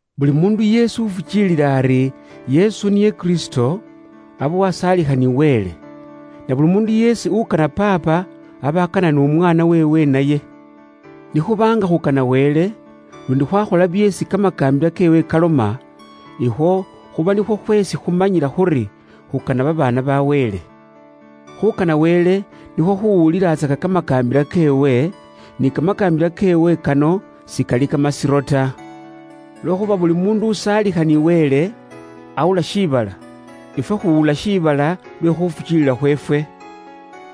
Buli muundu yeesi ufukiilila ari, Yesu niye Kristo, aba wasaalikha ni Wele. Na buli muundu yeesi ukana Paapa aba akana n'umwaana weewe naye. Ni khuba nga khukana Wele, luundi khwakhola byeesi kamakaambila keewe kaloma; ikhwo khuba nikhwo khweesi khumanyila khuri khukana babaana ba Wele. Khuukana Wele, nikhwo khuwulilatsaka kamakaambila keewe, ni kamakaambila keewe kano sikali kamasiro ta. Lwekhuuba buli muundu uwasaalikha ni Wele, awula shiibala. Ifwe khuwula shiibala lwe khufukiilila khweefwe.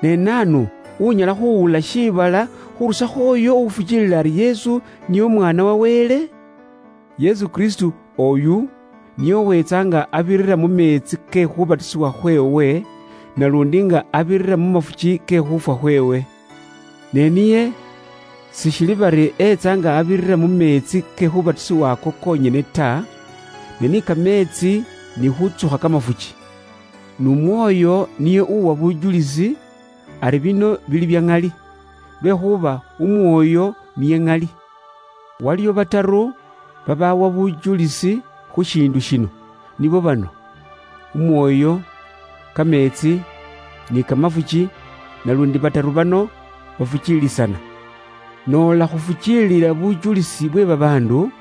Ne naanu unyala khuwula shiibala, khurusakho uyo ufukiilila ari, Yesu niye Umwaana wa Wele? Yesu Kristo oyu niye uweetsa nga abirira mu meetsi ke khuubatisibwa khweewe naluundi nga abirira mu mafuki ke khuufwa khweewe. Ne niye sishili bari etsa nga abirira mu meetsi ke khuubatisibwa ako konyene ta, ne ni kameetsi ni khuutsukha kamafuki. N'Umwoyo niye uuwa bujulisi ari bino bili bya ŋali. Lwekhuuba Umwoyo niye Ŋali. Waliwo bataru babaawa bujulisi khu shiindu shino, nibo bano; Umwoyo, kameetsi, ni kamafuki, naluundi bataru bano bafukiilisana. Noola khufukiilila bujulisi bwe babaandu,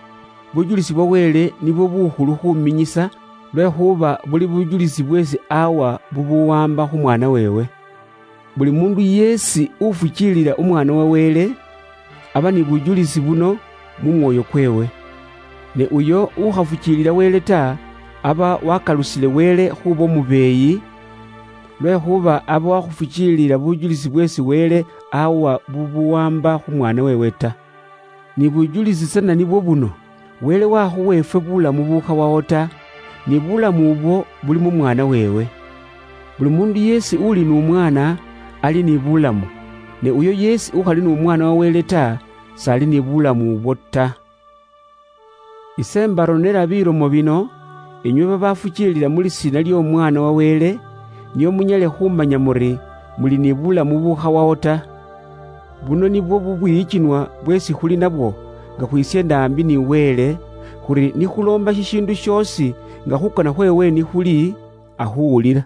bujulisi bwa Wele nibwo buukhulu khuuminyisa, lwekhuuba buli bujulisi bweesi awa bubuwaamba khu Mwaana weewe. Buli muundu yeesi ufukiilila Umwaana wa Wele, aba ni bujulisi buno mu mwoyo kweewe. Ne uyo ukhafukiilila Wele ta, aba wakalusile Wele khuuba umubeeyi, lwekhuuba aba wakhufukiilila bujulisi bweesi Wele awa bubuwaamba khu Mwaana weewe ta. Ni bujulisi tsana nibwo buno: Wele wakhuwa ifwe buulamu bukhawawo ta, ni bulamu ubwo buli mu Mwaana weewe. Buli muundu yeesi uli n'Umwaana, ali ni bulamu, ne uyo yeesi ukhali n'Umwaana wa Wele ta, s'ali ni bulamu ubwo ta. Ise mbaronela bilomo bino, inywe babafukiilila mu lisiina ly'Omwaana wa Wele, nio munyale khumanya muri, muli ni bulamu bukhawawo ta. Buno nibwo bubwiyikinwa bweesi khuli nabwo nga khwisyeenda aambi ni Wele, khuri ni khuloomba shishiindu shoosi nga khuukana khweewe ni khuli, akhuwulila.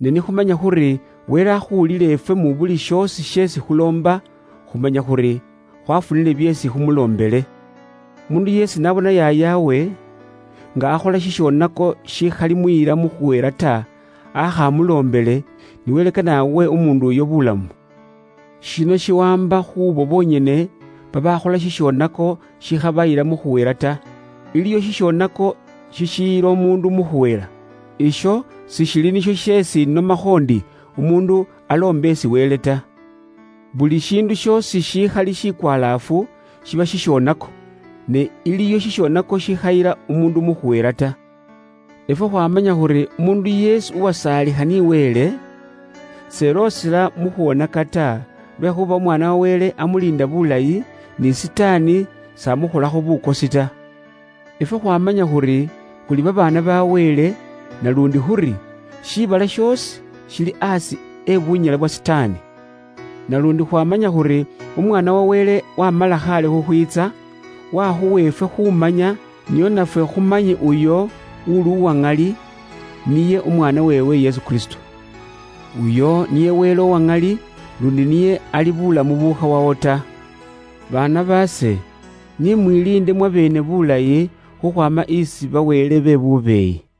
Ne ni khumanya khuri Wele akhuwulila ifwe mu buli shoosi sheesi khuloomba, khumanya khuri khwafunile byeesi khumuloombele. Umuundu yeesi n'abona yaayawe nga akhola shishoonako shikhalimuyila mu khuhela ta, aakha amuloombele, ni Wele kane awe umuundu uyo bulamu. Shino shiwaamba khuubo bonyene babaakhola shishoonako shikhabayila mu khuhela ta. Iliwo shishoonako shishiyila umuundu mu khuhela. Isho sishili nisho sheesi inomakho ndi umuundu aloombe isi Wele ta. Buli shiindu shoosi shishiili she bubwoonaki shiba shishonako, ne iliwo shishonako shikhayila umuundu mu khuhela ta. Ifwe khwaamanya khuri umuundu yeesi uwasaalikha ni Wele, s'eloosela mu khwonaka ta, lwekhuuba Umwaana wa Wele amuliinda bulayi, ni Sitaani s'amukholakho bukosi ta. Ifwe khwaamanya khuri, khuli babaana ba Wele naluundi khuri, shiibala shoosi shili aasi e bunyala bwa Sitaani. Naluundi khwaamanya khuri, Umwaana wa Wele waamala khaale khukhwiitsa, waakhuwa ifwe khuumanya, nio nafwe khumanye uyo uuli uwa ŋali; niye Umwaana weewe Yesu Kristo. Uyo niye Wele uwa ŋali, luundi niye ali bulamu bukhawawo ta. Baana baase, ni mwiliinde mwabeene buulayi isi ba wele be bubeeyi.